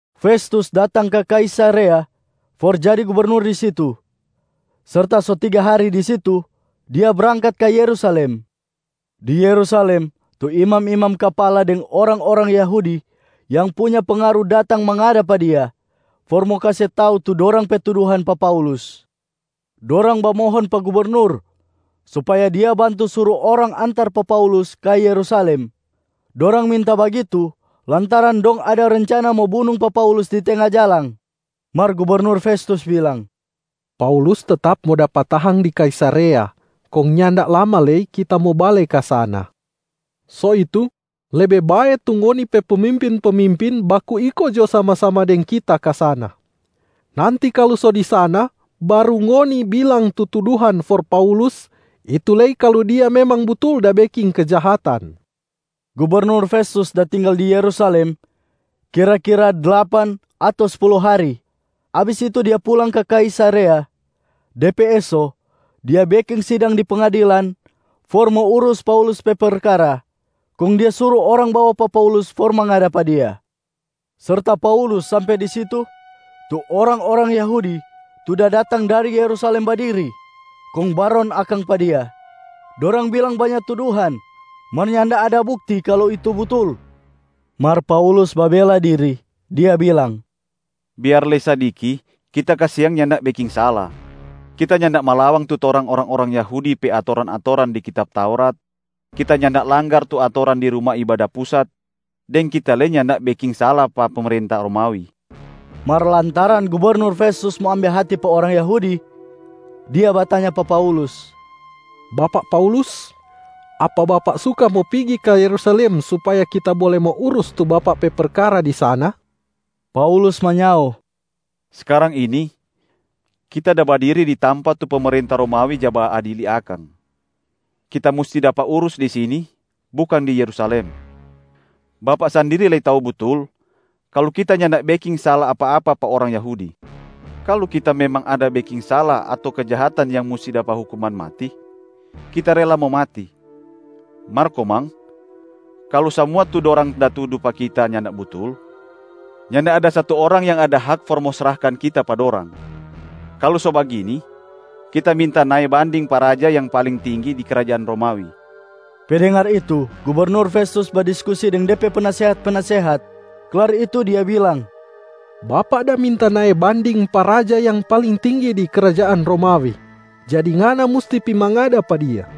Festus datang ka Kaisarea for jadi gubernur di situ. Serta so tiga hari di situ, dia brangkat ka Yerusalem. Di Yerusalem, tu imam-imam kapala deng orang-orang Yahudi yang punya pengaru datang mangada pa dia for mo kase tau tu dorang pe tuduhan pa Paulus. Dorang bamohon pa gubernur supaya dia bantu suru orang antar pa Paulus ka Yerusalem. Dorang minta bagitu lantaran dong ada rencana mo bunung pa Paulus di tenga jalang. Mar gubernur Festus bilang, “Paulus tetap mo dapa tahang di Kaisarea, kong nyanda lama lei kita mo bale ka sana. So itu, lebe bae tu ngoni pe pemimpin-pemimpin baku iko jo sama-sama deng kita ka sana. Nanti kalu so di sana baru ngoni bilang tu tuduhan for Paulus, itu lei kalu dia memang butul da beking kejahatan.” Gubernur Festus da tinggal di Yerusalem kira-kira dlapan ato spulu hari, abis itu dia pulang ka Kaisarea. De pe eso, dia beking sidang di pengadilan for mo urus Paulus pe perkara kong dia suru orang bawa pa Paulus for mangada pa dia. Serta Paulus sampe di situ, tu orang-orang Yahudi tu da datang dari Yerusalem badiri kong baron akang pa dia, dorang bilang banya tuduhan mar nyanda ada bukti kalu itu butul. Mar Paulus babela diri, dia bilang, “Biar lei sadiki, kita kasiang nyanda beking sala. Kita nyanda malawang tu torang orang-orang Yahudi pe atoran-atoran di kitab Taurat, kita nyanda langgar tu atoran di Ruma Ibada Pusat, deng kita lei nyanda beking sala pa pemerenta Romawi.” Mar lantaran Gubernur Festus mo ambe hati pa orang Yahudi, dia batanya pa Paulus, “Bapak Paulus, apa bapak suka mo pigi ka Yerusalem supaya kita bole mo urus tu bapak pe perkara di sana?” Paulus manyao, “Skarang ini kita da badiri di tampa tu pemerenta Romawi ja baadili akang. Kita musti dapa urus di sini, bukang di Yerusalem. Bapak sandiri lei tau butul kalu kita nyanda beking sala apa-apa pa orang Yahudi. Kalu kita memang ada beking sala ato kejahatan yang musti dapa hukuman mati, kita rela mo mati. Mar komang, kalu samua tu dorang da tudu pa kita nyanda butul, nyanda ada satu orang yang ada hak for mo srahkan kita pa dorang. Kalu so bagini, kita minta nae banding pa raja yang paling tinggi di krajaan Romawi!” Pe dengar itu, Gubernur Festus badiskusi deng de pe penasehat-penasehat, klar itu dia bilang, “Bapak da minta nae banding pa raja yang paling tinggi di krajaan Romawi, jadi ngana musti pi mangada pa dia.”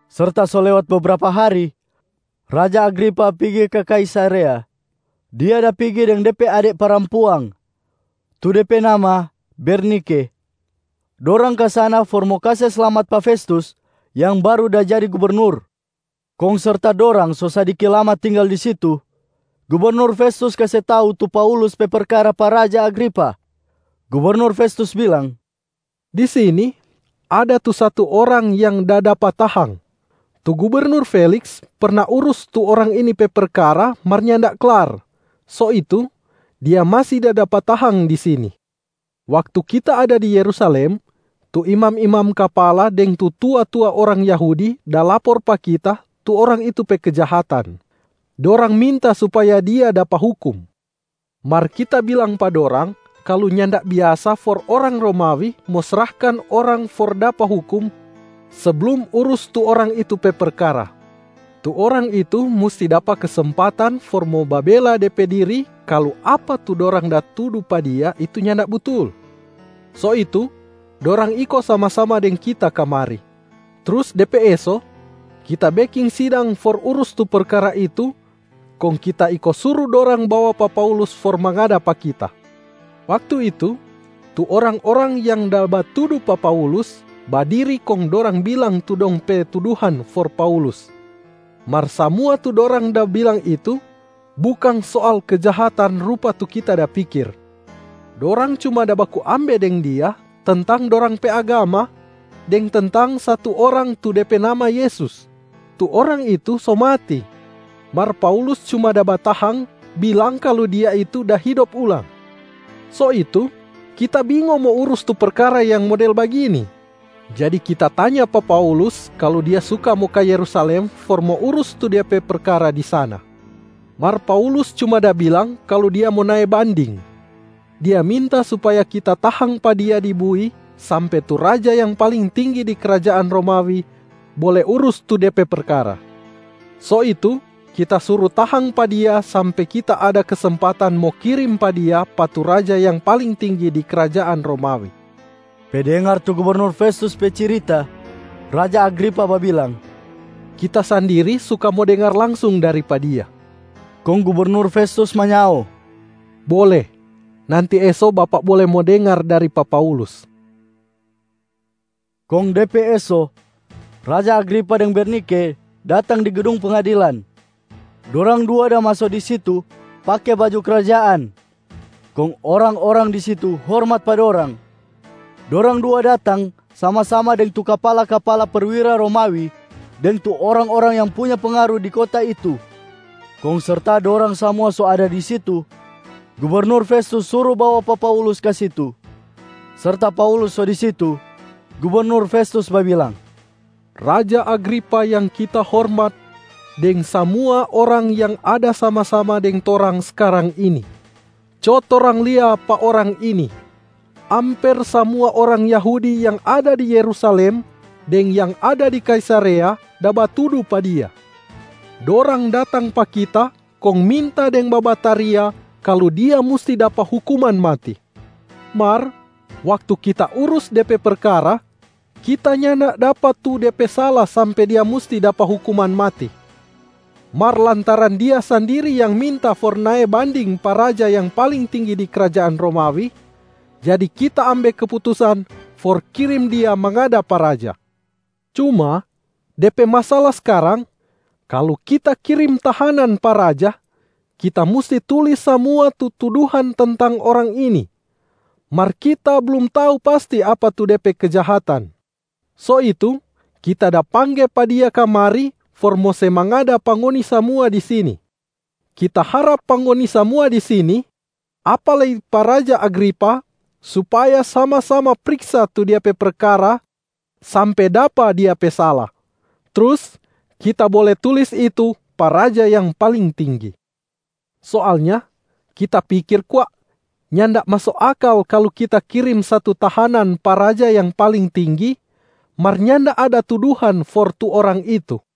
Serta so lewat bebrapa hari, raja Agripa pigi ka Kaisarea. Dia da pigi deng de pe ade parampuang, tu de pe nama Bernike. Dorang ka sana for mo kase slamat pa Festus yang baru da jadi gubernur. Kong serta dorang so sadiki lama tinggal di situ, gubernur Festus kase tau tu Paulus pe perkara pa raja Agripa. Gubernur Festus bilang, “Di sini, ada tu satu orang yang da dapa tahang. Tu gubernur Feliks perna urus tu orang ini pe perkara mar nyanda klar. So itu, dia masi da dapa tahang di sini. Waktu kita ada di Yerusalem, tu imam-imam kapala deng tu tua-tua orang Yahudi da lapor pa kita tu orang itu pe kejahatan. Dorang minta supaya dia dapa hukum. Mar kita bilang pa dorang kalu nyanda biasa for orang Romawi mo srahkan orang for dapa hukum seblum urus tu orang itu pe perkara. Tu orang itu musti dapa kesempatan for mo babela de pe diri kalu apa tu dorang da tudu pa dia itu nyanda butul. So itu, dorang iko sama-sama deng kita kamari. Trus de pe eso, kita beking sidang for urus tu perkara itu kong kita iko suru dorang bawa pa Paulus for mangada pa kita. Waktu itu, tu orang-orang yang da batudu pa Paulus badiri kong dorang bilang tu dong pe tuduhan for Paulus. Mar samua tu dorang da bilang itu, bukang soal kejahatan rupa tu kita da pikir. Dorang cuma da baku ambe deng dia tentang dorang pe agama, deng tentang satu orang tu de pe nama Yesus. Tu Orang itu so mati, mar Paulus cuma da batahang bilang kalu Dia itu da hidop ulang. So itu, kita bingo mo urus tu perkara yang model bagini. Jadi kita tanya pa Paulus kalu dia suka mo ka Yerusalem for mo urus tu de pe perkara di sana. Mar Paulus cuma da bilang kalu dia mo nae banding, dia minta supaya kita tahang pa dia di bui sampe tu raja yang paling tinggi di krajaan Romawi bole urus tu de pe perkara. So itu kita suru tahang pa dia sampe kita ada kesempatan mo kirim pa dia pa tu raja yang paling tinggi di krajaan Romawi.” Pe dengar tu gubernur Festus pe cirita, raja Agripa babilang, “Kita sandiri suka mo dengar langsung dari pa dia.” Kong gubernur Festus manyao, “Bole, nanti eso bapak bole mo dengar dari pa Paulus.” Kong de pe eso, raja Agripa deng Bernike datang di gedung pengadilan. Dorang dua da maso di situ pake baju krajaan kong orang-orang di situ hormat pa dorang. Dorang dua datang sama-sama deng tu kapala-kapala perwira Romawi deng tu orang-orang yang punya pengaru di kota itu. Kong serta dorang samua so ada di situ, gubernur Festus suru bawa pa Paulus ka situ. Serta Paulus so di situ, gubernur Festus babilang, “Raja Agripa yang kita hormat deng samua orang yang ada sama-sama deng torang skarang ini. Co torang lia pa orang ini, amper samua orang Yahudi yang ada di Yerusalem deng yang ada di Kaisarea da batudu pa dia. Dorang datang pa kita kong minta deng babataria kalu dia musti dapa hukuman mati. Mar waktu kita urus de pe perkara, kita nyanda dapa tu de pe sala sampe dia musti dapa hukuman mati. Mar lantaran dia sandiri yang minta for nae banding pa raja yang paling tinggi di krajaan Romawi, jadi kita ambe keputusan for kirim dia mangada pa raja. Cuma de pe masala skarang, kalu kita kirim tahanan pa raja, kita musti tulis samua tu tuduhan tentang orang ini, mar kita blum tau pasti apa tu de pe kejahatan. So itu kita da pangge pa dia kamari for mo se mangada pa ngoni samua di sini. Kita harap pa ngoni samua di sini, apa lei pa raja Agripa supaya sama-sama priksa tu dia pe perkara sampe dapa dia pe sala, trus kita bole tulis itu pa raja yang paling tinggi. Soalnya kita pikir kwa, nyanda maso akal kalu kita kirim satu tahanan pa raja yang paling tinggi mar nyanda ada tuduhan for tu orang itu.”